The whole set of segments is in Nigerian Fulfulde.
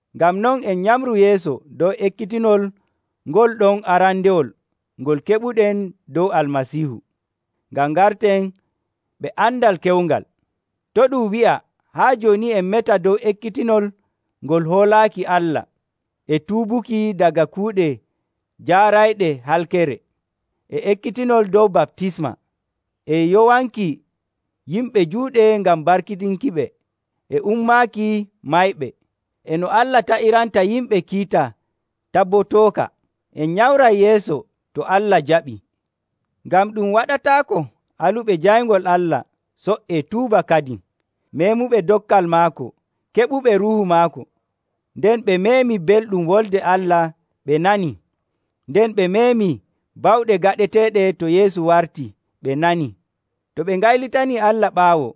Ngam non, en nyamru yeeso dow ekkitinol ngol ɗon arandewol ngol keɓuɗen dow Almasiihu, ngam ngarten ɓe andal kewngal. To' ɗum wi'a haa jooni en meta dow ekkitinol ngol hoolaaki Allah, e tuubuki daga kuuɗe jaarayɗe halkere, e ekkitinol dow baptisma, e yowanki yimɓe juuɗe ngam barkiɗinkiɓe, e ummaaki mayɓe, e no Allah taƴiranta yimɓe kiita tabotooka. En nyamray yeeso, to Allah jaɓii. Ngam ɗum waɗataako aluɓe jayngol Allah co''ee tuuba kadin, meemuɓe dokkal maako, keɓuɓe Ruuhu maako. Nden ɓe meemii belɗum Wolde Allah ɓe nanii, nden ɓe meemii bawɗe gaɗeteeɗe to Yeesu wartii, ɓe nanii. To ɓe ngaylitanii Allah ɓaawo,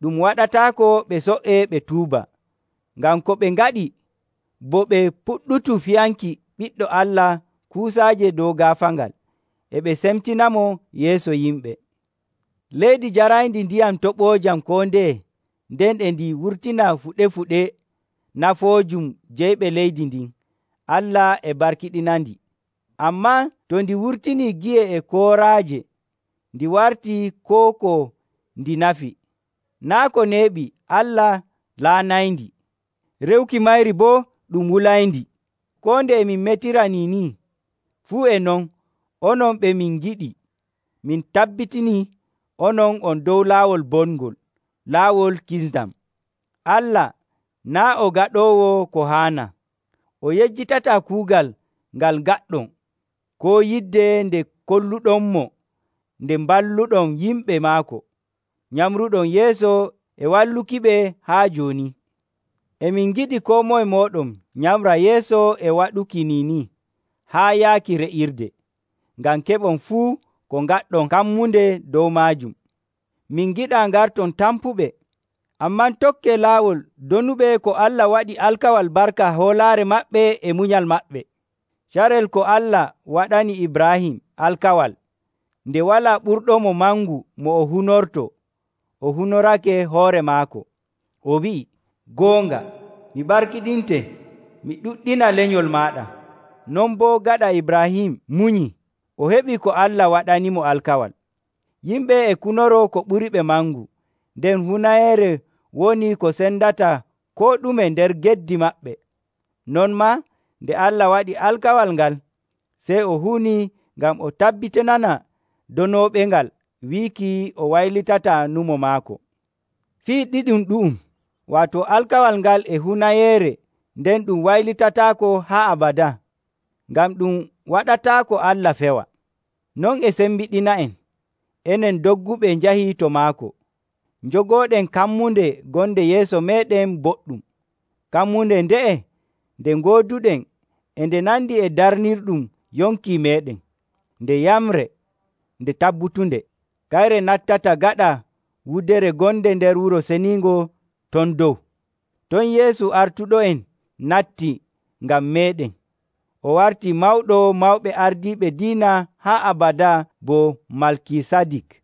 ɗum waɗataako ɓe co''ee ɓe tuuba, ngam ko ɓe ngaɗi bo ɓe puɗɗutu fiyanki Ɓiɗɗo Allah kuusaaje dow gaafaangal, e ɓe cemtinamo yeeso yimɓe. Leydi njarayndi ndiyam toɓoojam koo ndeye, nden e ndi wurtina fuɗe‑fuɗe nafanoojum jeyɓe leydi ndin, Allah e barkiɗinandi. Ammaa to ndi wurtinii gi'e e kooraaje, ndi wartii koo ko ndi nafi, naa' ko neeɓi Allah laanayndi, re'uki mayri boo ɗum wulayndi. Koo nde e min metira niini, fuu e non, onon ɓe min ngiɗi, min tabbitinii onon on dow laawol bongol, laawol kisndam. Allah naa' o gaɗoowo ko haanaa. O yejjitataa kuugal ngal ngaɗɗon koo yidde nde kolluɗonmo nde mballuɗon yimɓe maako, nyamruɗon yeeso e wallukiɓe haa jooni. E min ngiɗi koo moye mooɗon nyamra yeeso e waɗuki niini haa yaaki re'irde, ngam keɓon fuu ko ngaɗɗon kammunde dow maajum. Min ngiɗaa ngarton tampuɓe, ammaa tokkee laawol donuɓe ko Allah waɗi alkawal barka hoolaare maɓɓe e munyal maɓɓe. Carel ko Allah waɗani Ibraahim alkawal, nde walaa ɓurɗomo mangu mo o hunortoo, o hunorake hoore maako, o wi'ii, “Goonga, mi barkiɗinte mi ɗuɗɗina lenyol maaɗa.” Non boo, gaɗa Ibraahim munyii, o heɓii ko Allah waɗanimo alkawal. Yimɓe e kunoroo ko ɓuriɓe mangu, nden hunayeere woni ko sendata koo ɗume nder geddi maɓɓe. Non maa, nde Allah waɗi alkawal ngal, sey o hunii ngam o tabbitinana donooɓengal wiiki o waylitataa nyumo maako. Fii ɗiɗum ɗu'um, waato alkawal ngal e hunayeere nden ɗum waylitataako haa abadaa, ngam ɗum waɗataako Allah fewa. Non e sembiɗina'en, enen dogguɓe njahi to maako, njogooɗen kammunde gonde yeeso meeɗen boɗɗum. Kammunde nde'e nde ngooduɗen e nde nandi e darnirɗum yonki meeɗen. Nde yamre nde tabbutunde. Kayre nattata gaɗa wudere gonde nder wuro ceniingo ton dow. Ton Yeesu artuɗo'en natti ngam meeɗen. O wartii mawɗo mawɓe ardiiɓe diina haa abadaa bo Malkisadik.